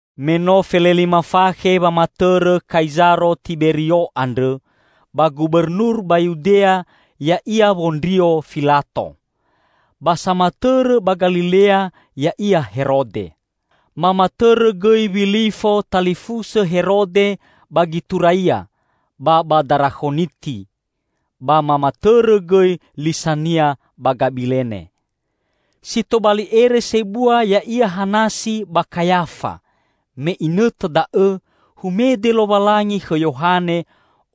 Me no felelima fakhe wamatõrõ Kaizaro Tiberio andrõ, ba gubernur ba Yudea ya'ia Wondrio Filato, ba samatõrõ ba Galilea ya'ia Herode. Mamatõrõ gõi Wilifo talifusõ Herode ba Gituraia ba ba Darakhoniti, ba mamatõrõ gõi Lisania ba Gabilene. Si tobali ere sebua ya'ia Hanasi ba Kayafa. Me inõtõ da'õ humede Lowalangi khõ Yohane,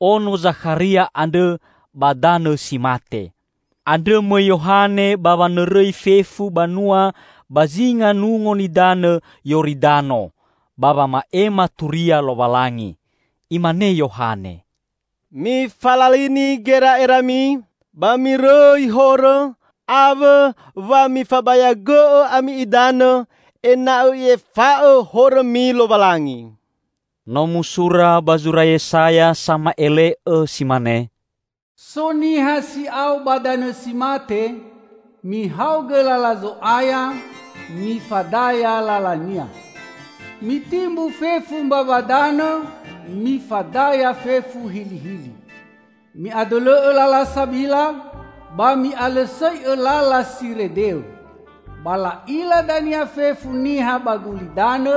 ono Zakharia andrõ ba danõ si mate. Andrõ mõi Yohane ba wanõrõi fefu banua ba zinga Nungo Nidanõ Yoridano ba wama'ema Turia Lowalangi. Imane Yohane, "Mifalalini gera'erami ba mirõi horõ, awõ wa mifabayagõ'õ ami idanõ, ena'õ I'efa'õ horõmi Lowalangi." No musura ba zura Yesaya sama'ele'õ si mane, "So niha si'ao ba danõ si mate, 'Mihaogõ lala Zo'aya, mifadaya lala-Nia. Mitimbu fefu mbawa danõ mifadaya fefu hilihili. Mi'adõlõ'õ lala sabila, ba mi'alõsõi'õ lala si redeõ. Ba la'ila dania fefu niha ba gulidanõ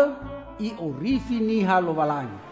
I'orifi niha Lowalangi!'"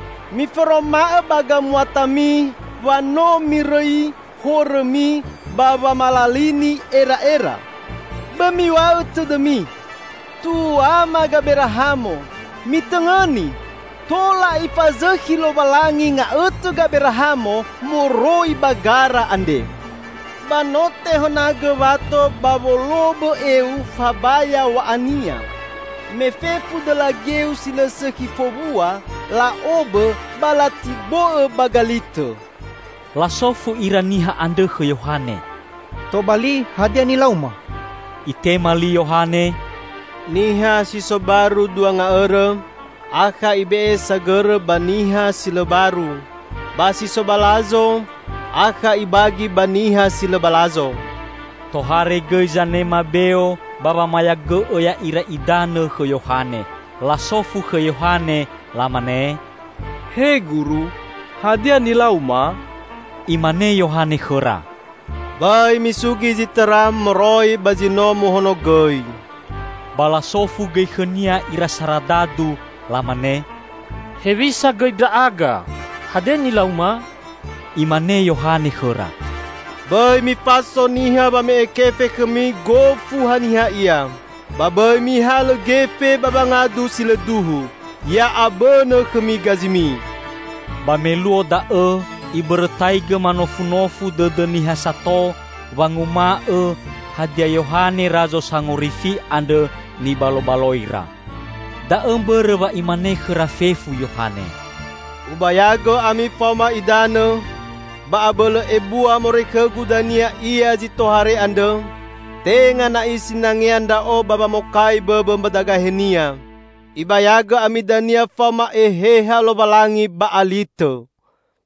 Miforoma'õ ba gamuatami wa no mirõi horõmi ba wamalalini era'era! Bõi miw̃a'õ tõdõmi, 'Tuama Gaberahamo.' Mitõngõni: Tola Ifazõkhi Lowalangi nga'õtõ Gaberahamo moroi ba gara andre! Ba no tehõnagõ wato ba wolobõ eu fabaya w̃a'ania. Me fefu dõla geu si lõ sõkhi fowua, la'obõ ba latibo'õ ba galitõ." Lasofu ira niha andrõ khõ Yohane, "Tobali, hadia nilauma?" Itema li Yohane, "Niha si so baru dua nga'õrõ akha ibe'e sagõrõ ba niha si lõ baru; ba si so balazo, akha ibagi ba niha si lõ balazo." Tohare gõi zanema beo ba wamayagõ'õ ya'ira idanõ khõ Yohane. Lasofu khõ Yohane, Lamane, "He Guru, hadia nilauma?" Imane Yohane khõra, "Bõi misugi zi tõra moroi ba zi no muhonogõi." Ba lasofu gõi khõnia ira saradadu, lamane, "Hewisa gõi ndra'aga? Hadia nilauma?" Imane Yohane khõra, "Bõi mifaso niha wame'e kefe khõmi gofu haniha ia, ba bõi mihalõ gefe ba wangadu si lõ duhu, ya'abõnõ khõmi gazimi!" Ba me luo da'õ ibõrõtaigõ manofunofu dõdõ niha sato, wanguma'õ, hadia Yohane Razo Sangorifi andrõ nibalobaloira. Da'õ mbõrõ wa imane khõra fefu Yohane, "Ubayagõ ami faoma idanõ, ba abõlõ ebua moroi khõgu dania Ia zi tohare andrõ, tenga na'i sinangea ndra'o ba wamokai bõbõ mbadagahe-Nia. Ibayagõ ami dania faoma Eheha Lowalangi ba alitõ.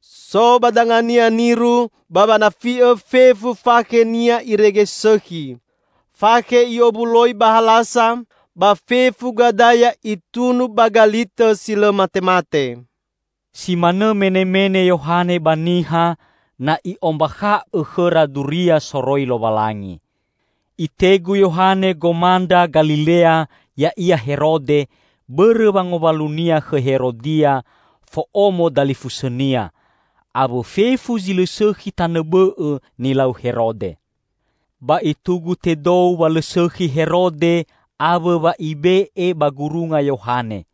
So ba danga-Nia niru ba wanafi'õ fefu fakhe-Nia irege sõkhi. Fakhe I'owuloi ba halasa, ba fefu gadaya Itunu ba galitõ si lõ matemate!" Si manõ menemene Yohane ba niha, na i'ombakha'õ khõra duria soroi Lowalangi. Itegu Yohane gomandra Galilea, ya'ia Herode, bõrõ wangowalunia khõ Herodia, fo'omo dalifusõnia, awõ fefu zi lõ sõkhi tanõ bõ'õ nilau Herode. Ba itugu tedou wa lõ sõkhi Herode awõ wa ibe'e ba gurunga Yohane.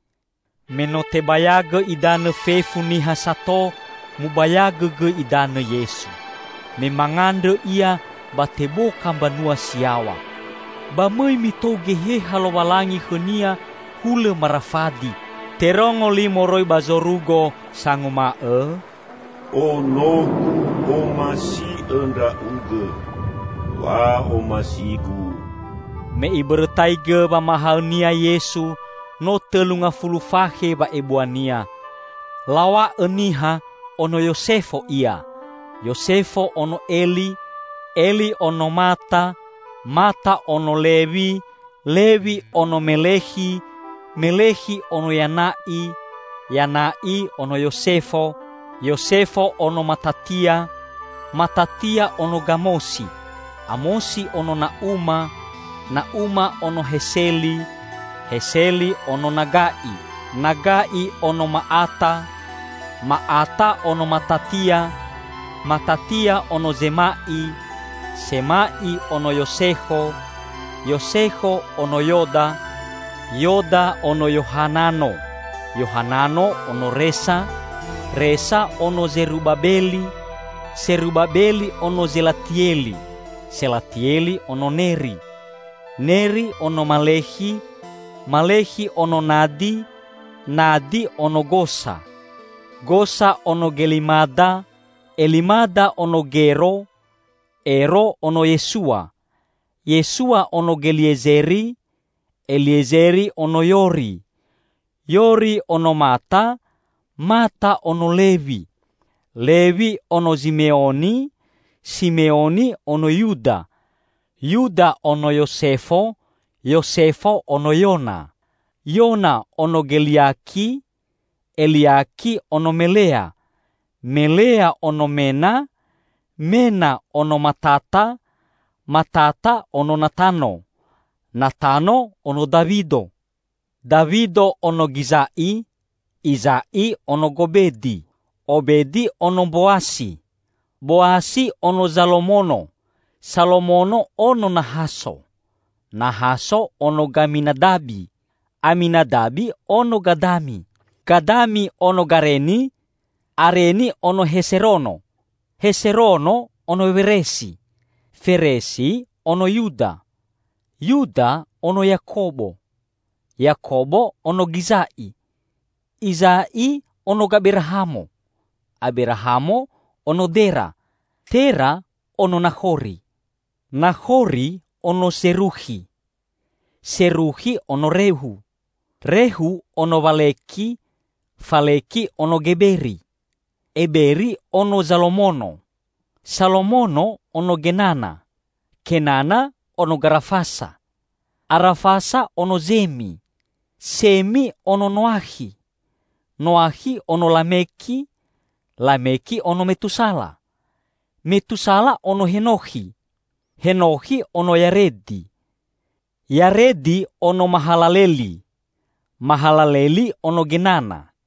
Me no tebayagõ idanõ fefu niha sato, mubayagõ gõi idanõ Yesu. Me mangandrõ Ia, ba teboka mbanua si yaw̃a. Ba mõi mitou Geheha Lowalangi khõ-Nia hulõ marafadi. Terongo li moroi ba zorugo sanguma'õ, "Ono-Gu omasiõ Ndra'ugõ. Wa'omasi-Gu." Me Ibõrõtaigõ wamahaõ-Nia Yesu, no tõlu ngafulu fakhe wa'ebua-Nia. Law̃a'õ niha, ono Yosefo Ia, Yosefo ono Eli, Eli ono Mata, Mata ono Lewi, Lewi ono Melekhi, Melekhi ono Yana'i, Yana'i ono Yosefo, Yosefo ono Matatia, Matatia ono Gamosi, Amosi ono Na'uma, Na'uma ono Heseli, Heseli ono Naga'i, Naga'i ono Ma'ata, Ma'ata ono Matatia, Matatia ono Zema'i, Sema'i ono Yosekho, Yosekho ono Yoda, Yoda ono Yohanano, Yohanano ono Resa, Resa ono Zerubabeli, Serubabeli ono Zelatieli, Selatieli ono Neri, Neri ono Malekhi, Malekhi ono Nadi, Nadi ono Gosa, Gosa ono Gelimada, Elimada ono Gero, Ero ono Yesua, Yesua ono Geliezeri, Eliezeri ono Yori, Yori ono Mata, Mata ono Lewi, Lewi ono Zimeoni, Simeoni ono Yuda, Yuda ono Yosefo, Yosefo ono Yona, Yona ono Geliaki, Eliaki ono Melea, Melea ono Mena, Mena ono Matata, Matata ono Natano, Natano ono Dawido, Dawido ono Giza'i, Iza'i ono Gobedi, Obedi ono Mboasi, Boasi ono Zalomono, Salomono ono Nahaso, Nahaso ono Gaminadabi, Aminadabi ono Gadami, Gadami ono Gareni, Areni ono Heserono, Heserono ono Weresi, Feresi ono Yuda, Yuda ono Yakobo, Yakobo ono Giza'i, Iza'i ono Gaberahamo, Aberahamo ono Dera, Tera ono Nakhori, Nakhori ono Zerukhi, Serukhi ono Rehu, Rehu ono Waleki, Faleki ono Geberi, Eberi ono Zalomono, Salomono ono Genana, Kenana ono Garafasa, Arafasa ono Zemi, Semi ono Noakhi, Noakhi ono Lameki, Lameki ono Metusala, Metusala ono Henokhi, Henokhi ono Yaredi, Yaredi ono Mahalaleli, Mahalaleli ono Genana,